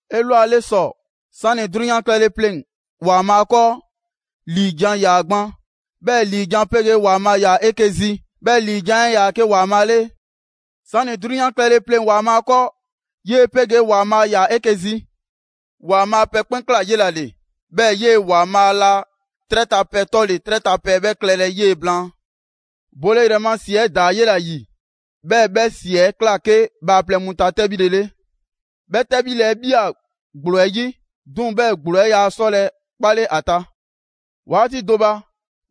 'Elwale ‑sɔ, 'sani‑ 'drunyan klɛle pleŋ‑ ‑Waanbhaa' 'kɔɔ, ‑liijan' ‑yaa' gban; 'bhɛɛ‑ ‑liijan' 'pegee ‑Waanbhaa' ‑yaa 'eke‑ zi, 'bhɛɛ‑ ‑liijan' 'ɛ 'yaa‑ 'ke ‑Waanbhaa' 'le. 'Sani‑ 'drunyan klɛle pleŋ‑ ‑Waanbhaa' 'kɔɔ, 'yee‑ 'pegee ‑Waanbhaa ‑yaa 'eke‑ zi. ‑Waanbhaa' pɛ 'kpɛn ꞊kla 'yela‑ ‑le. 'Bhɛɛ‑ 'yee‑ ‑Waanbhaa' laa 'trɛ ta pɛ 'tɔle‑ 'trɛ ta pɛ 'bhɛ klɛlɛ 'yee‑ blaan. Bole ‑yrɛ ma ‑si 'ɛ ꞊daa 'yela‑ ‑yi, 'bhɛɛ‑ 'bhɛ ‑si 'ɛ ꞊kla 'ke bhaaplɛŋ mu ta 'tɛbhile 'le. 'Bhɛ 'tɛbhile 'ɛ ꞊bhia ‑gblo 'ɛ 'yi, 'duŋ‑ 'bhɛɛ‑ ‑gblo 'ɛ yaa 'sɔlɛ‑ 'kpale ‑a ta. 'Waati do ba,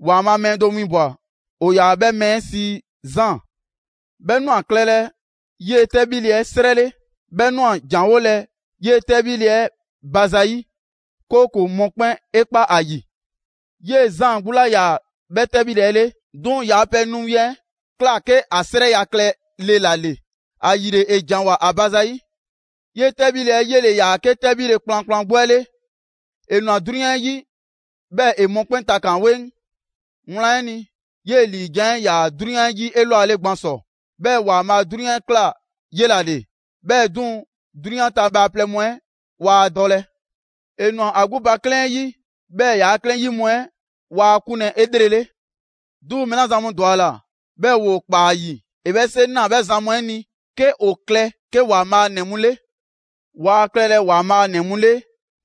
‑Waanbhaa' mɛɛ do winbwa‑, ‑o ‑yaa 'bhɛ mɛɛ 'ɛ sii Zaan. 'Bhɛ ꞊nwa klɛlɛ 'yee‑ 'tɛbhile 'ɛ 'srɛ 'le. 'Bhɛ ꞊nwa ‑janwolɛ 'yee‑ 'tɛbhile 'ɛ ba zayi', 'kooko‑ mɔkpɛn' 'e kpa ‑a ‑yi. 'Yee‑ Zaan 'gbu 'laa ‑yaa 'bhɛ 'tɛbhile 'ɛ 'le. 'Duŋ‑ yaa pɛ nu win 'ɛ ꞊kla 'ke ‑a 'srɛya‑ klɛle ‑la ‑le, ‑ayile ‑e ‑janwoa ‑a ba zayi'. 'Yee‑ 'tɛbhile 'ɛ 'yele‑ ‑yaa 'ke 'tɛbhile kplankplan 'gbu 'ɛ 'le, ‑e ꞊nwa 'drunyan 'ɛ 'yi, 'bhɛɛ‑ ‑e mɔkpɛn' takan 'weŋ. Wlan 'ɛ ni, 'yee‑ ‑liijan' 'ɛ 'yaa‑ 'drunyan 'yi 'elwale gban ‑sɔ. 'Bhɛɛ‑ ‑Waanbhaa' 'drunyan 'ɛ ꞊kla 'yela‑ 'le, 'bhɛɛ‑ 'duŋ‑, 'drunyan ta bhaaplɛŋ mu 'ɛ waa ‑a dɔlɛ. ‑E ‑nwa ‑a 'gbu ba 'klɛɛn 'ɛ 'yi, 'bhɛɛ‑ ‑yaa' 'klɛɛn 'yi mu 'ɛ waa ‑a 'kunlɛ‑ 'elrele. 'Duŋ‑ mɛɛ 'la zan mu ‑dwa ‑a ‑la, 'bhɛɛ‑ ‑woo ‑kpaa ‑a ‑yi, ‑e 'bhɛ 'seŋ 'naa‑ 'bhɛ zan mu 'ɛ ni 'ke ‑o klɛ 'ke ‑Waanbhaa' ‑nɛ mu 'le. Waa klɛlɛ ‑Waanbhaa' ‑nɛ 'mu 'le,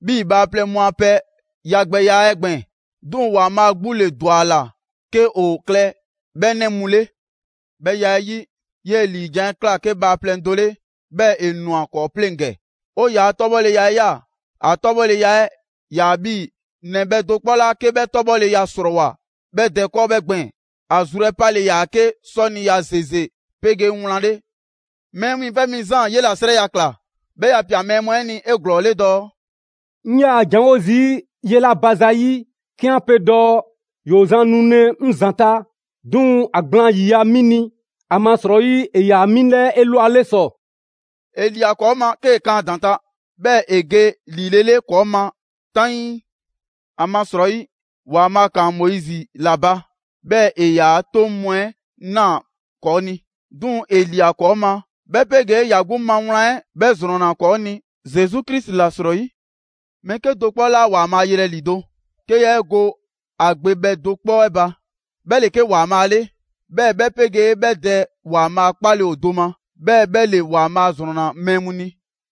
'bhii‑ bhaaplɛŋ mu a pɛ yagbɛya 'ɛ gbɛɛn‑. 'Duŋ‑ ‑Waanbhaa' 'gbu ‑le ‑dwa ‑a ‑la 'ke ‑o klɛ 'bhɛ 'nɛ mu 'le. 'Bhɛ ya 'ɛ 'yi, 'yee‑ ‑liijan' 'ɛ ꞊kla 'ke bhaaplɛŋ do 'le, 'bhɛɛ‑ ‑e ꞊nwa ‑kɔɔ' 'pleŋ‑ ‑gɛ. 'O ‑yaa' 'tɔbhɔleya 'ɛ ꞊ya. ‑A 'tɔbhɔleya 'ɛ 'yaa‑ 'bhii‑ ‑Nɛ bhɛ do 'kpɔ 'la 'ke 'bhɛ 'tɔbhɔleya ‑srɔɔwoa 'bhɛ Dɛ 'kɔɔ 'bhɛɛ‑ gbɛɛn‑. ‑A zru 'ɛ 'pale‑ ‑yaa 'ke 'sɔniya ‑zeze 'pegee wlan 'le. Mɛɛ Wiiŋfɛ' Mi Zaan 'yela‑ 'srɛya‑ ꞊kla, 'bhɛɛ‑ ‑ya ‑pia mɛɛ mu 'ɛ ni 'eglɔɔle dɔɔ: «'Ŋ 'yaa‑ ‑janwo' zii' 'yela‑ ba zayi' 'ke 'an pe dɔɔ: ‹‑Yoo zan nulɛ 'ŋ ‑zanta', 'duŋ‑ ‑a gblaan ‑yiya' 'mi ni, ‑amasrɔyi ‑e ‑yaa 'mi 'lɛɛ 'elwale ‑sɔ.›» ‑E ‑lia 'kɔɔ ma 'kee‑ kan ‑a ‑daŋ' ta, 'bhɛɛ‑ ‑e ge ‑lilele ‑kɔɔ' ma 'taŋii. ‑Amasrɔyi, ‑Waanbhaa' ‑kaan Moizi ‑la ba, 'bhɛɛ‑ ‑e ‑yaa' 'toŋ mu 'ɛ ꞊naa ‑kɔɔ' ni. 'Duŋ‑ ‑e ‑lia ‑kɔɔ' ma, 'bhɛ 'pegee ‑ya 'gbu ma wlan 'ɛ 'bhɛ ‑zrɔnna ‑kɔɔ' ni Zesu Krisi ‑la 'srɔyi. Mɛɛ 'kedo‑ do 'kpɔ 'laa ‑Waanbhaa' yelɛ ‑lido; 'ke yaa 'e go ‑a Gbe bhɛ do 'kpɔ 'ɛ ba. 'Bhɛ ‑le 'ke ‑Waanbhaa' 'le, 'bhɛɛ‑ 'bhɛ 'pegee 'bhɛ Dɛ ‑Waanbhaa' 'kpale‑ ‑o do ma. 'Bhɛɛ‑ 'bhɛ ‑le ‑Waanbhaa' ‑zrɔnna mɛɛ mu ni.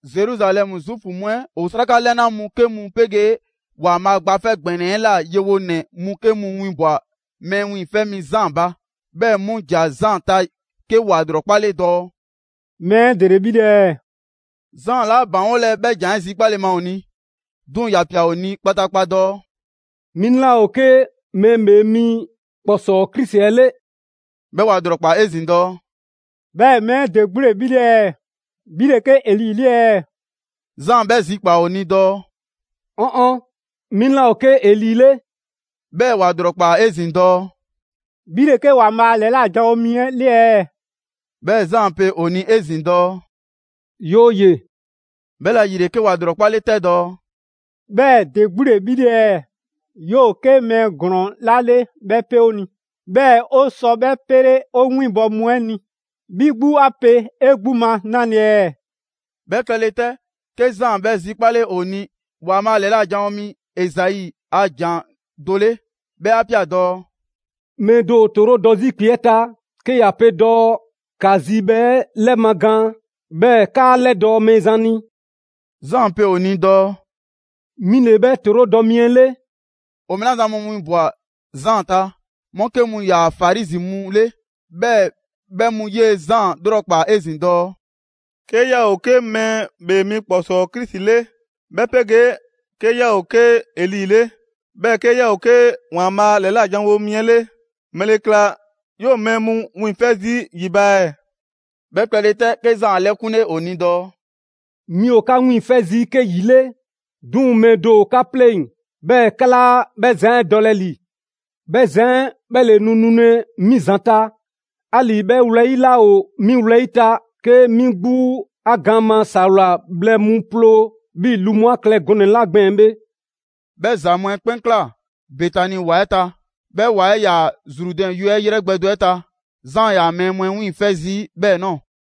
Zeruzalɛmu Zuufu mu 'ɛ ‑o 'sraka 'lɛna mu 'ke mu 'pegee ‑Waanbhaa' Gba 'Fɛ ‑Gbɛnɛ 'ɛ la yewonɛ mu 'ke mu winbwa‑ Mɛɛ Wiiŋfɛ' Mi Zaan ba. 'Bhɛɛ‑ 'mu ‑ja Zaan ta 'ke ‑wa ‑lrɔkpale dɔɔ: «Mɛɛ 'ɛ ‑dele 'bhi 'le ɛɛ?» Zaan 'laa ‑baŋgolɛ 'bhɛ ‑jan 'ɛ zikpale ma ‑o ni, 'duŋ‑ ‑ya ꞊pia ‑o ni kpataakpa dɔɔ: «'Mi 'laa ‑o 'ke Mɛɛ ‑Bhee Mi ‑Kpɔsɔɔ Krisi 'ɛ 'le.» 'Bhɛɛ‑ ‑wa ‑lrɔkpaa 'ezin‑ dɔɔ: «'Bhɛɛ‑ mɛɛ 'ɛ ‑de 'gbu ‑le 'bhi 'le ɛɛ? 'Bhi ‑le 'ke Eli 'le ɛɛ?» Zaan 'bhɛ zikpaa‑ ‑o ni dɔɔ: «'Ɔn ɔn, 'mi 'laa ‑o 'ke Eli 'le.» 'Bhɛɛ‑ ‑wa ‑lrɔkpaa 'ezin‑ dɔɔ: «'Bhi ‑le 'ke ‑Waanbhaa' ‑lɛla' janwo mi 'ɛ 'le ɛɛ?» 'Bhɛɛ‑ Zaan pe ‑o ni 'ezin‑ dɔɔ: «'Yooye‑.» 'Bhɛla‑ ‑yile, 'ke ‑wa ‑lrɔkpale 'tɛ dɔɔ: «'Bhɛɛ‑ ‑de 'gbu ‑le 'bhi 'le ɛɛ? 'Yoo‑ 'ke mɛɛ ‑glɔɔn 'la 'le 'bhɛ 'pe 'o ni, 'bhɛɛ‑ 'o sɔ 'bhɛ 'pele 'o 'winbɔ‑ mu 'ɛ ni. 'Bhi 'gbu 'a pe 'e 'gbu ma 'nale‑ ɛɛ?» 'Bhɛ klɛle 'tɛ, 'ke Zaan 'bhɛ zikpale ‑o ni ‑Waanbhaa' ‑lɛla' janwo mi Ezai a ‑jan do 'le. 'Bhɛ 'a ꞊pia dɔɔ: «Mɛɛ do ‑o ‑toorodɔ 'zi ‑kpe 'ɛ ta 'ke ‑ya pe dɔɔ: ‹‑Ka zibhɛ 'ɛ 'lɛmagaan, 'bhɛɛ‑ ‑kaa 'lɛdɔɔ‑ Mɛɛzan ni›. Zaan pe ‑o ni dɔɔ: ‹'Mi ‑le 'bhɛ ‑toorodɔ mi 'ɛ 'le.›» ‑O mɛɛ 'la zan mu 'winbwa‑ Zaan ta, 'mu 'ke mu ‑yaa Farizi mu 'le. 'Bhɛɛ‑ 'bhɛ mu 'yee‑ Zaan 'lrɔkpaa‑ 'ezin‑ dɔɔ: «'Ke 'yaa‑ ‑o 'ke Mɛɛ ‑Bhee Mi ‑Kpɔsɔɔ Krisi 'le, 'bhɛ 'pegee 'ke 'yaa ‑o 'ke Eli 'le, 'bhɛɛ‑ 'ke 'yaa ‑o 'ke ‑Waanbhaa' ‑lɛla' janwo mi 'ɛ 'le, ‑mɛle ‑kla 'yoo‑ mɛɛ mu wiiŋfɛ' zii' ‑yi ba ɛɛ?» 'Bhɛ klɛle 'tɛ, 'ke Zaan 'a 'lɛkunle ‑o ni dɔɔ: «'Mi ‑o 'ka wiiŋfɛ' zii' 'ke ‑yi 'le, 'duŋ‑ mɛɛ do ‑o 'ka 'pleŋ‑, 'bhɛɛ‑ 'ka 'laa 'bhɛ zan 'ɛ dɔlɛ ‑li. 'Bhɛ zan 'ɛ, 'bhɛ ‑le nu nulɛ 'mi ‑zanta', 'ali‑ 'bhɛ wlɛyi' laa ‑o 'mi wlɛyi' ta 'ke 'mi 'gbu ‑a gaan ma ‑sawla bhlɛ mu ploo 'bhii‑ lu mu a klɛ gɔnɛ‑ 'la gbɛɛn‑ bhe.» 'Bhɛ ‑za mu 'ɛ 'kpɛn ꞊kla Betani ‑wa 'ɛ ta. 'Bhɛ ‑wa 'ɛ 'yaa‑ Zrudɛn yue 'yrɛ gbɛ do 'ɛ ta. Zaan 'yaa‑ mɛɛ mu 'ɛ wiiŋfɛ' zii' 'bhɛɛ‑ ꞊nɔɔ.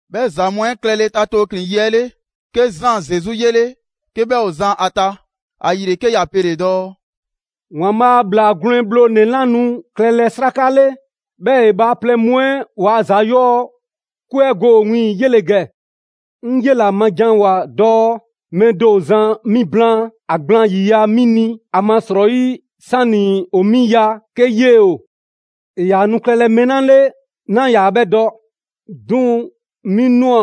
'Bhɛ ‑za mu 'ɛ klɛle ta tooklin‑ yi 'ɛ 'le, 'ke Zaan Zesu 'yele 'ke 'bhɛ ‑o zan ‑a ta. ‑Ayile, 'ke ‑ya pele‑ dɔɔ: «‑Waanbhaa' ‑Bhlaa Gwlɛn Bhlonɛ‑ 'la nu klɛlɛ 'sraka 'le, 'bhɛɛ‑ ‑e bhaaplɛŋ mu 'ɛ ‑waa' ‑za 'yɔɔ‑ 'kwe go ‑o wiiŋ‑, 'yele‑ ‑gɛ! 'Ŋ 'yela‑ ma ‑janwoa dɔɔ: ‹Mɛɛ do ‑o zan mi blaan, ‑a gblaan ‑yiya' 'mi ni; ‑amasrɔyi 'sani‑ ‑o 'mi ya, 'ke 'yee‑ ‑o.› ‑E ‑yaa nu klɛlɛ mɛɛ 'la 'le, 'naa ‑yaa 'bhɛ dɔ. 'Duŋ‑ 'mi ꞊nwa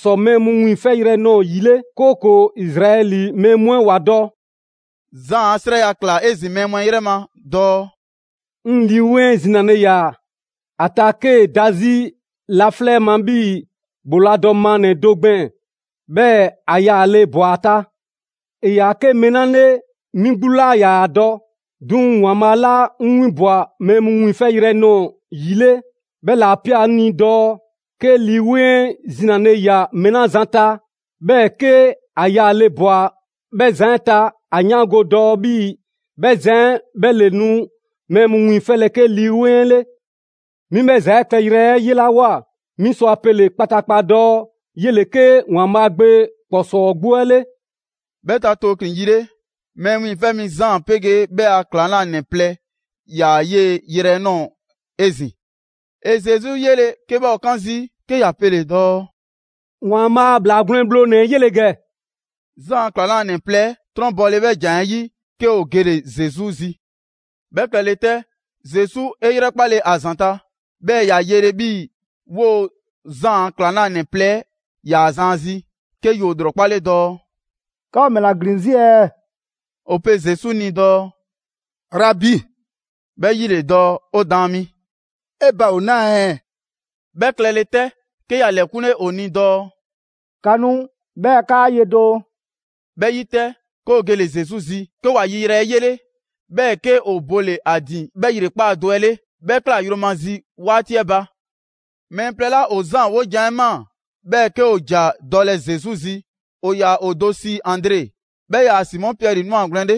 ‑sɔ mɛɛ mu wiiŋfɛyrɛ nɔɔ‑ ‑yi 'le, 'kooko‑ Izraɛli mɛɛ mu 'ɛ ‑wa dɔ.» Zaan 'a 'srɛya‑ ꞊kla 'ezin‑ mɛɛ mu 'ɛ 'yrɛ ma dɔɔ: «'Ŋ Lii 'Weŋ 'ɛ zinale ꞊ya ‑a ta 'kee‑ da 'zi laflɛ' 'ɛ ma 'bhii‑ ‑bhooladɔ maannɛ‑ do gbɛɛn‑, 'bhɛɛ‑ ‑a yaale ꞊bwa ‑a ta. ‑E ‑yaa 'ke mɛɛ 'la 'le, 'mi 'gbu 'laa ‑yaa ‑a dɔ. 'Duŋ‑ ‑Waanbhaa' 'la 'ŋ 'winbwa‑ mɛɛ mu wiiŋfɛyrɛ nɔɔ‑ ‑yi 'le, 'bhɛ ‑la ꞊pia 'ŋ ni dɔɔ: ‹'Kee Lii 'Weŋ 'ɛ zinale ꞊ya mɛɛ 'la zan ta, 'bhɛɛ‑ 'ke ‑a yaale ꞊bwa 'bhɛ zan 'ɛ ta, ‑a 'yaango‑ dɔɔ 'bhii‑ 'bhɛ zan 'ɛ 'bhɛ ‑le nu mɛɛ mu wiiŋfɛlɛ 'ke Lii‑ 'Weŋ 'ɛ 'le.› 'Mi 'bhɛ ‑za 'ɛ klɛyrɛ 'ɛ 'yelawoa, 'mi sɔ ‑a pele‑ kpataakpa dɔɔ 'yele‑ 'ke ‑Waanbhaa' Gbe ‑Kpɔsɔɔ 'gbu 'ɛ 'le.» 'Bhɛ ta tooklin‑ yi 'le, Mɛɛ Wiiŋfɛ' Mi Zaan 'pegee 'bhɛ a ‑klaŋlanɛ plɛ ‑yaa 'yee‑ yrɛ 'ɛ ꞊nɔɔ‑ 'ezin‑. ‑E Zesu 'yele‑ 'ke 'bhɛ ‑o 'kan zii', 'ke ‑ya pele‑ dɔɔ: «‑Waanbhaa' a ‑Bhlaa Gwlɛn Bhlonɛ‑ 'ɛ 'yele‑ ‑gɛ!» Zaan a ‑klaŋlanɛ plɛ 'trɔnbɔle 'bhɛ ‑jan 'ɛ 'yi, 'ke ‑o gele‑ Zesu zi. 'Bhɛ klɛle 'tɛ, Zesu 'e 'yrɛkpale ‑a ‑zanta', 'bhɛɛ‑ ‑ya yele 'bhii‑ 'woo‑ Zaan a ‑klaŋlanɛ plɛ 'ɛ 'yaa‑ zan ‑a zi, 'ke ‑yoo ‑lrɔkpale dɔɔ: «'Ka ‑o ‑mɛla ‑glin 'zi ɛɛ?» ‑O pe Zesu ni dɔɔ: «Rabi ('bhɛ 'yi ‑le dɔɔ: ‹'O Daan mi›), 'e ba ‑o 'naa ɛɛ?» 'Bhɛ klɛle 'tɛ, 'ke ‑ya ‑lɛkunle ‑o ni dɔɔ: «‑Ka nu 'bhɛɛ‑ 'kaa ye doo.» 'Bhɛ 'yi 'tɛ, 'ke ‑o gele‑ Zesu zi, 'ke ‑wa ‑yi yrɛ 'ɛ 'yele; 'bhɛɛ‑ 'ke ‑o bole‑ ‑a ‑din 'bhɛ ‑yrekpaa' do 'ɛ 'le. 'Bhɛ ꞊kla yromazi 'waati 'ɛ ba. Mɛɛ plɛ 'la ‑o Zaan 'wojan‑ 'ɛ ꞊maa, 'bhɛɛ‑ 'ke ‑o ‑ja dɔlɛ Zesu zi, ‑o ‑yaa ‑o do sii Andre, 'bhɛ 'yaa‑ Simɔ Piɛri 'nwagwlɛn‑ 'le.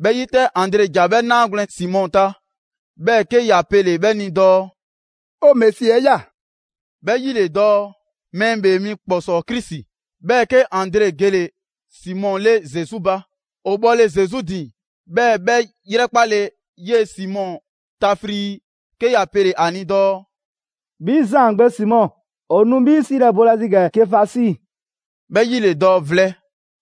'Bhɛ 'yi 'tɛ, Andre ‑ja 'bhɛ 'naagwlɛn‑ Simɔ ta, 'bhɛɛ‑ 'ke ‑ya pele‑ 'bhɛ ni dɔɔ: «'O Mesi 'ɛ ꞊ya!» 'Bhɛ 'yi ‑le dɔɔ: ‹Mɛɛ ‑Bhee Mi ‑Kpɔsɔɔ Krisi›. 'Bhɛɛ‑ 'ke Andre gele‑ Simɔ 'le Zesu ba. ‑O bhɔle Zesu ‑din, 'bhɛɛ‑ 'bhɛ 'yrɛkpale 'yee‑ Simɔ ta frii, 'ke ‑ya pele‑ ‑a ni dɔɔ: «'Bhi Zaan gbe Simɔ, ‑o nu 'bhi 'siilɛ‑ boolazi ‑gɛ Kefasi, 'bhɛ 'yi ‑le dɔɔ: ‹Vlɛ›.»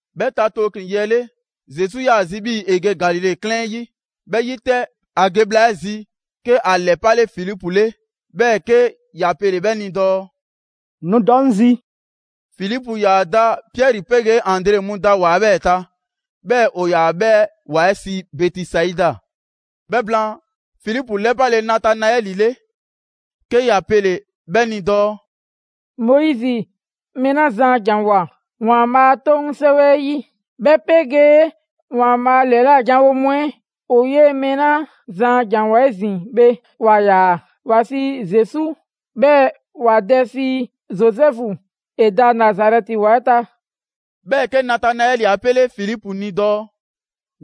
'Bhɛ ta tooklin‑ yi 'ɛ 'le, Zesu 'yaa‑ zi 'bhii‑ ‑e ge Galile 'klɛɛn 'ɛ 'yi. 'Bhɛ 'yi 'tɛ, ‑a ge bhla 'ɛ zi, 'ke ‑a ‑lɛpale Filipu 'le, 'bhɛɛ‑ 'ke ‑ya pele‑ 'bhɛ ni dɔɔ: «Nu dɔ 'ŋ zi!» Filipu ‑yaa da Piɛri 'pegee Andre mu da ‑wa 'ɛ 'bhɛɛ‑ ta, 'bhɛɛ‑ ‑o ‑yaa 'bhɛ ‑wa 'ɛ sii Bɛtisaida. 'Bhɛ blaan, Filipu 'lɛpale Natanaɛli 'le, 'ke ‑ya pele‑ 'bhɛ ni dɔɔ: «Moizi mɛɛ 'la zan a ‑janwoa ‑Waanbhaa' a 'Toŋ 'sɛwɛ 'ɛ 'yi, 'bhɛ 'pegee ‑Waanbhaa' ‑lɛla' janwo mu 'ɛ ‑o 'yee‑ mɛɛ 'la zan a ‑janwoa 'ezin‑ bhe, 'wa ꞊ya. ‑Wa sii Zesu, 'bhɛɛ‑ ‑wa dɛ sii Zozɛfu, ‑e da Nazarɛti ‑wa 'ɛ ta.» 'Bhɛɛ‑, 'ke Natanaɛli 'a 'pele Filipu ni dɔɔ: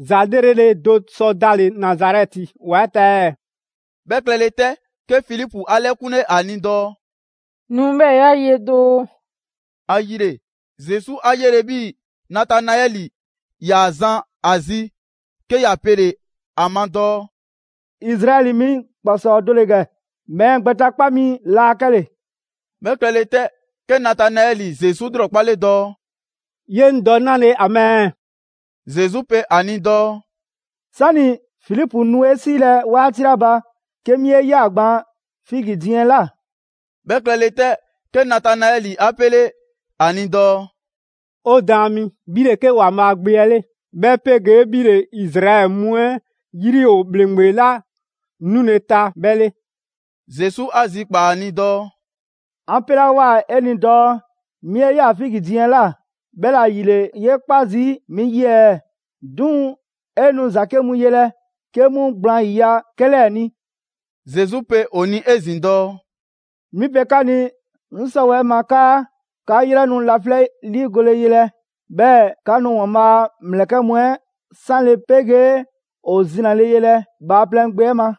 «‑Za 'lrele‑ do sɔ dale‑ Nazarɛti ‑wa 'ɛ ta ɛɛ?» 'Bhɛ klɛle 'tɛ, 'ke Filipu 'a 'lɛkunle ‑a ni dɔɔ: «Nu 'bhɛɛ‑ 'ya ye doo.» ‑Ayile, Zesu 'a 'yele‑ 'bhii‑ Natanaɛli ‑yaa zan ‑a zi, 'ke ‑ya pele‑ ‑a ma dɔɔ: «Izraɛli mi ‑kpɔsɔɔ do ‑le ‑gɛ, mɛɛ gbɛtakpa mi laa 'kɛle‑.» 'Bhɛ klɛle 'tɛ, 'ke Natanaɛli Zesu 'lrɔkpale dɔɔ: «Ye 'ŋ dɔ 'nale‑ ‑a ma ɛɛ?» Zesu pe ‑a ni dɔɔ: «'Sani‑ Filipu nu 'e 'siilɛ‑ 'waati 'la ba, 'ke 'mi 'e ꞊ya gban figi diiŋ 'ɛ ꞊la.» 'Bhɛ klɛle 'tɛ, 'ke Natanaɛli 'a 'pele ‑a ni dɔɔ: «'O Daan mi, 'bhi ‑le 'ke ‑Waanbhaa' Gbe 'ɛ 'le, 'bhɛ 'pegee 'bhi ‑le Izraɛli mu 'ɛ 'yri ‑o ‑Bhleŋgbe 'la 'nule‑ ta 'bhɛ 'le!» Zesu 'a zikpaa‑ ‑a ni dɔɔ: «'An 'pelawoa 'e ni dɔɔ 'mi 'e ꞊ya figi diiŋ 'ɛ ꞊la, 'bhɛla‑ ‑yile 'yee 'kpa zii' 'mi 'yi ɛɛ? 'Duŋ‑ 'e nu ‑za 'ke mu yelɛ 'ke 'mu gblaan ‑yiya' 'kɛ 'lɛɛ‑ ni.» Zesu pe ‑o ni 'ezin‑ dɔɔ: «'Mi pe 'ka ni 'ŋ 'sɔwɛɛ‑ ma 'kaa 'ka 'yrɛ nu laflɛ' 'liigole yelɛ, 'bhɛɛ‑ 'ka nu ‑Waanbhaa' a ‑mlɛkɛ' 'mu 'ɛ 'sanle‑ 'pegee ‑o ‑zinale yelɛ Bhaaplɛŋ Gbe 'ɛ ma!»